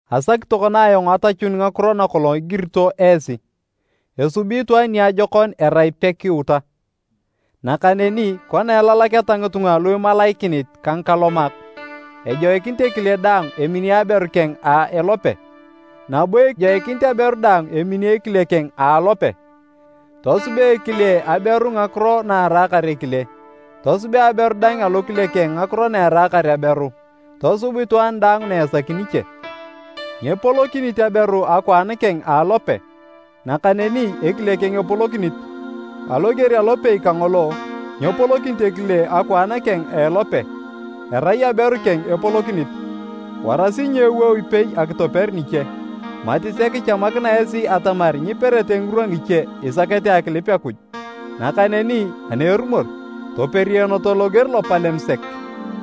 Asaki tokona ayong atachun ngakiro nakolong igirito esi. Esubi itwaan niajokon erai pekiuta. Nakaneni kona elalaketa ngitunga lu imalaikinit ka ngikalomak, ejoikinit ekile daang emini aberu keng a elope, nabo ejoikinit aberu daang emini ekile keng a alope. Tosubea ekile aberu ngakiro na eraakar ekile, tosubea aberu dang alokile keng ngakiro na eraakar aberu, tosub itwaan daang na esaki niche. Nyepolokinit aberu akwaan keng a alope, nakaneni ekile keng epolokinit, aloger alopei kangolo, nyepolokinit ekile akwaan keng a elope, erai aberu keng epolokinit. Warasi nyeewou ipei akitoper niche, mati sek ichamakina esi atamar nyiperete ngirwa ngiche isakete akilip Akuj. Nakaneni ani erumor, toperionoto loger lopalem sek.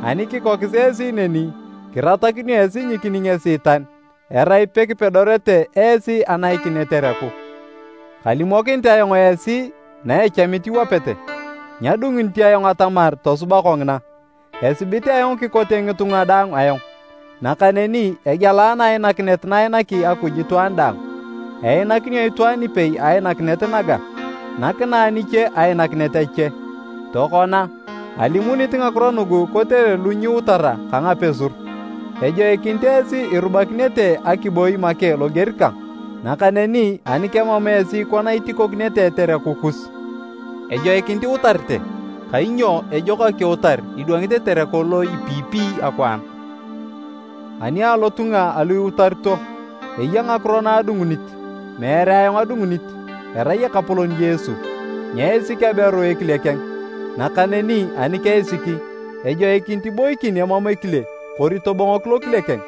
Ani kikokis esi neni, kiratakinio esi nyikining Esiitan erai pekipedorete esi anaikin etereku. Kalimokinit ayong esi na echamit iwapete, nyadungunit ayong atamar tosuba kongina. Esibit ayong kikote ngitunga daang ayong, nakaneni egealana ainakinet na ainaki Akuj itwaan daang. Einakinio itwaan ipei ainakinet naga, nakinae niche ainakinet ache. Tokona, alimunit ngakiro nugu kotere lu nyiutara ka ngapuseru, ejoikinit esi irubakinete akiboi make loger kang. Nakaneni ani kemam esi kona itikokinete etereku kus, ejoikinit iutarete kainyo ejok akiutar idwangit etereku lo ipeyipeyi akwaan. Ani alotunga alu iutarito, eya ngakiro na adungunit, meere ayong adungunit, erai Ekapolon Yesu. Nyeisik aberu ekile keng, nakaneni ani keisiki, ejoikinit iboikin emam ekile kori tobongok lokile keng,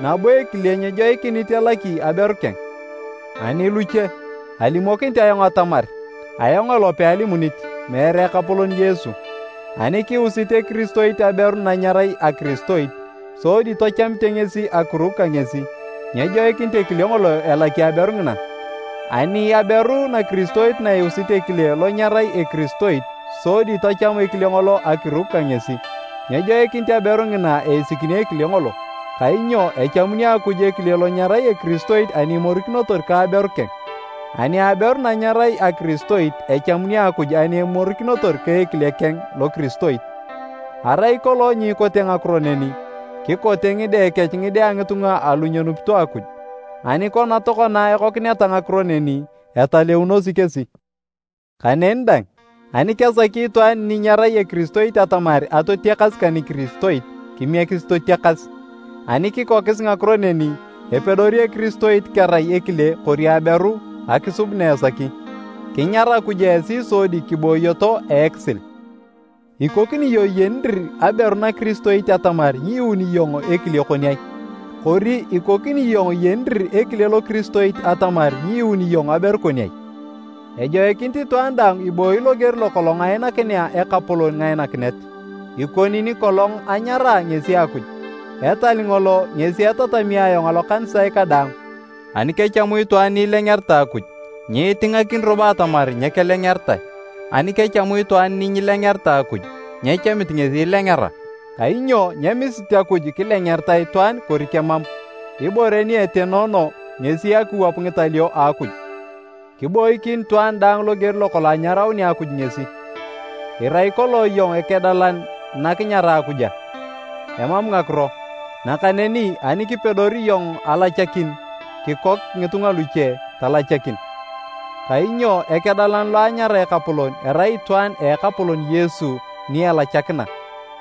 nabo ekile nyejoikinit elaki aberu keng. Ani luche, alimokinit ayong atamar (ayong elope alimunit, meere Ekapolon Yesu), ani kiusit ekiristoit aberu na nyerai akiristoit, sodi tachamite ngesi akiruk ka ngesi, nyejoikinit ekile ngolo elaki aberu ngina. Ani aberu nakiristoit na iusit ekile lo nyerai ekiristoit sodi tacham ekile ngolo akiruk ka ngesi, nyejoikinit aberu ngina eisikini ekile ngolo. Kainyo echamuni Akuj ekile lo nyerai ekiristoit ani imorikinotor ka aberu keng, ani aberu na nyerai akiristoit, echamuni Akuj ani imorikinotor ka ekile keng lokiristoit. Arai kolong nyikote ngakiro neni, kikote ngide kech ngide a ngitunga alu nyenupito Akuj. Ani kona tokona ekokineta ngakiro neni, etaleunosi kesi. Kaneni dang, ani kesaki itwaan ni nyerai ekiristoit atamar atotiakas ka nikiristoit, kimiekisi totiakas. Ani kikokis ngakiro neni, epedori ekiristoit kerai ekile kori aberu, akisub na esaki. Kinyar Akuj esi sodi kibooyoto a ekisil. Ikokini iyong iyeni dir aberu nakiristoit atamar nyiyuuni iyong ekile kon ai? Kori ikokini iyong iyeni dir ekile lokiristoit atamar nyiyuuni iyong aberu kon ai? Ejoikinit itwaan daang ibooyi loger lokolong ainakinea Ekapolon ngainakinet, ikoni nikolong anyaraa ngesi Akuj. Etal ngolo ngesi etatami ayong alokanisae kadaang. Ani kechamu itwaan ni ilengeritae Akuj, nyiitingakin robo atamar nyekelengeritae, ani kechamu itwaan ni nyilengeritae Akuj, nyechamit ngesi ilengera. Kainyo nyemisit Akuj kilengeritae itwaan kori kemam, ibore ni etenoono ngesi akiwap ngitalio a Akuj. Kiboikin itwaan daang loger lokolong anyaraunea Akuj ngesi. Irai kolong iyong ekedalan na kinyaraa Akuj a? Emam ngakiro, nakaneni ani kipedori iyong alachakin, kikok ngitunga luche, talachakin. Kainyo ekedalan lo anyara Ekapolon, erai itwaan a Ekapolon Yesu ni elachakina,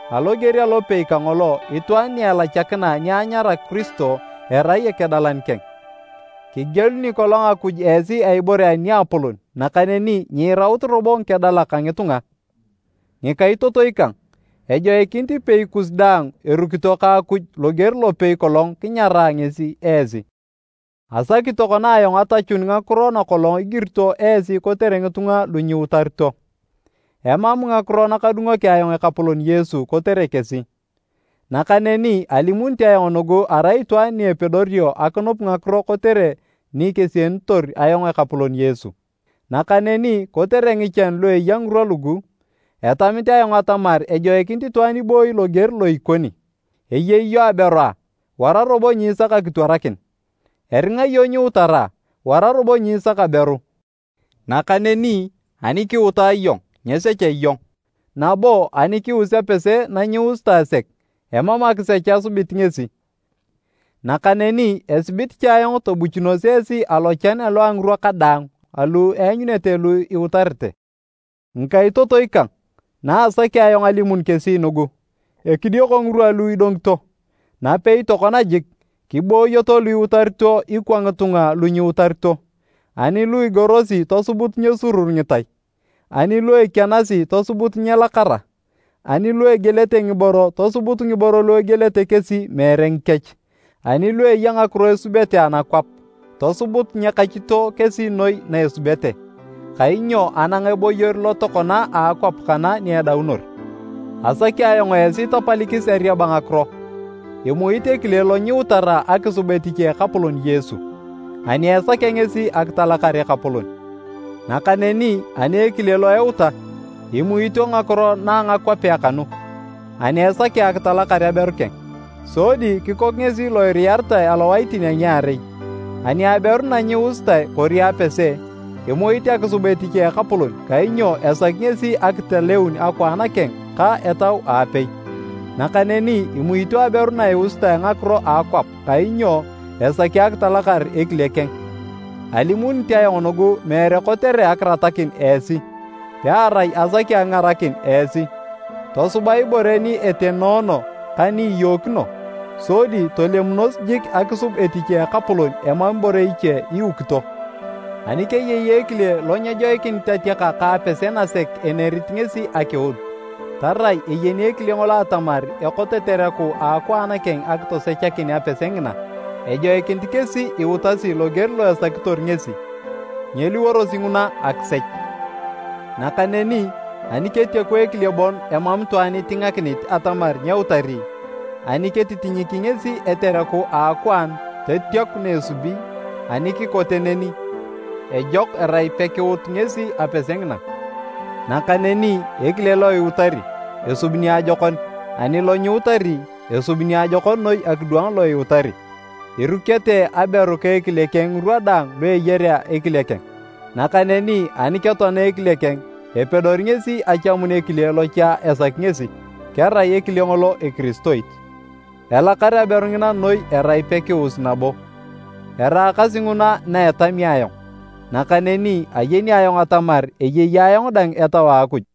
aloger alopei kangolo itwaan ni elachakina ni anyara Kiristo, erai ekedalan keng. Kigieluni kolong Akuj esi a ibore aniapolon nakaneni nyiiraut robo ngikedalak a ngitunga. Ngikaitotoi kang, ejoikinit ipei kus daang erukito ka Akuj loger lopei kolong kinyaraa ngesi esi. Asaki tokona ayong atachun ngakiro nakolong igirito esi kotere ngitunga lu nyiutarito. Emam ngakiro nakadungoki ayong Ekapolon Yesu kotere kesi. Nakaneni alimunit ayong nugu arai itwaan ni epedorio akinup ngakiro kotere ni kesienitor ayong Ekapolon Yesu. Nakaneni, kotere ngichan lu eya ngirwa lugu, etamit ayong atamar ejoikinit itwaan ibooyi loger lo ikoni. Eyei iyong aberu a? Wara robo nyisak akitwarakin. Eringa iyong nyiutara? Wara robo nyiisak aberu. Nakaneni ani kiuta iyong, nyesecha iyong, nabo ani kius apese na nyiusitae sek, emam akisech esubit ngesi. Nakaneni esibit cha ayong tobuchunos esi alochan alu a ngirwa kadaang alu eanyunete lu iutarete. Ngikaitotoi kang, na asaki ayong alimun kesi nugu: ekidioko ngirwa lu idongito. Napei tokona jik, kiboyoto lu iutarito ikwa ngitunga lu nyiutarito. Ani lu igorosi tosubut nyesurur ngitai, ani lu ekianasi tosubut nyelakara, ani lu egielete ngiboro, tosubut ngiboro lu egielete kesi meere ngikech. Ani lu eya ngakiro esubete anakwap, tosubut nyekachito kesi noi na esubete, kainyo anang eboyor lo tokona a akwap kana ni edaunor. Asaki ayong esi tapalikis ariaba ngakiro. Imuit ekile lo nyiutara akisub etich a Ekapolon Yesu, ani esakea ngesi akitalakar Ekapolon. Nakaneni ani ekile lo euta, imuito ngakiro na ngakwapea kanu, ani esakea akitalakar aberu keng. Sodi kikok ngesi lo iriyaritae alowaitin a ngiarei. Ani aberu na nyiusitae kori apese, imuit akisub etich a Ekapolon kainyo esaki ngesi akitaleun akwaan keng ka etau aapei. Nakaneni imuito aberu na iusitae ngakiro a akwap kainyo esaki akitalakar ekile keng. Alimunit ayong nugu meere kotere akiratakin esi, pearai asaki akingarakin esi, tosuba ibore ni etenoono ka ni iyookino, sodi tolemunos jik akisub etich a Ekapolon emam ibore iche iukito. Ani keyei ekile lo nyejoikinit atiaka ka apese nasek enerit ngesi akiut, tarai eyeni ekile ngolo atamar ekot etereku a akwaan keng akitosechakin apese ngina, ejoikinit kesi iutasi loger lo esakitor ngesi. Nyeliworosi nguna akisech. Nakaneni ani ketiaku ekile bon emam itwaan itingakinit atamar nyeutari, ani ketitinyiki ngesi etereku a akwaan totiaku na esubi, ani kikote neni, ejok erai pekiut ngesi apese ngina. Nakaneni ekile lo iutari, esubi niajokon, ani lo nyiutari, esubi niajokon noi akidwang lo iutari. Irukete aberu ka ekile keng ngirwa daang lu eyarea ekile keng. Nakaneni ani ketoana ekile keng, epedori ngesi achamun ekile lo cha esaki ngesi, kerai ekile ngolo ekiristoit. Elakar aberu ngina noi erai pekius nabo. Eraakasi nguna na etami ayong, nakaneni ayeni ayong atamar eyei ayong dang Etau a Akuj.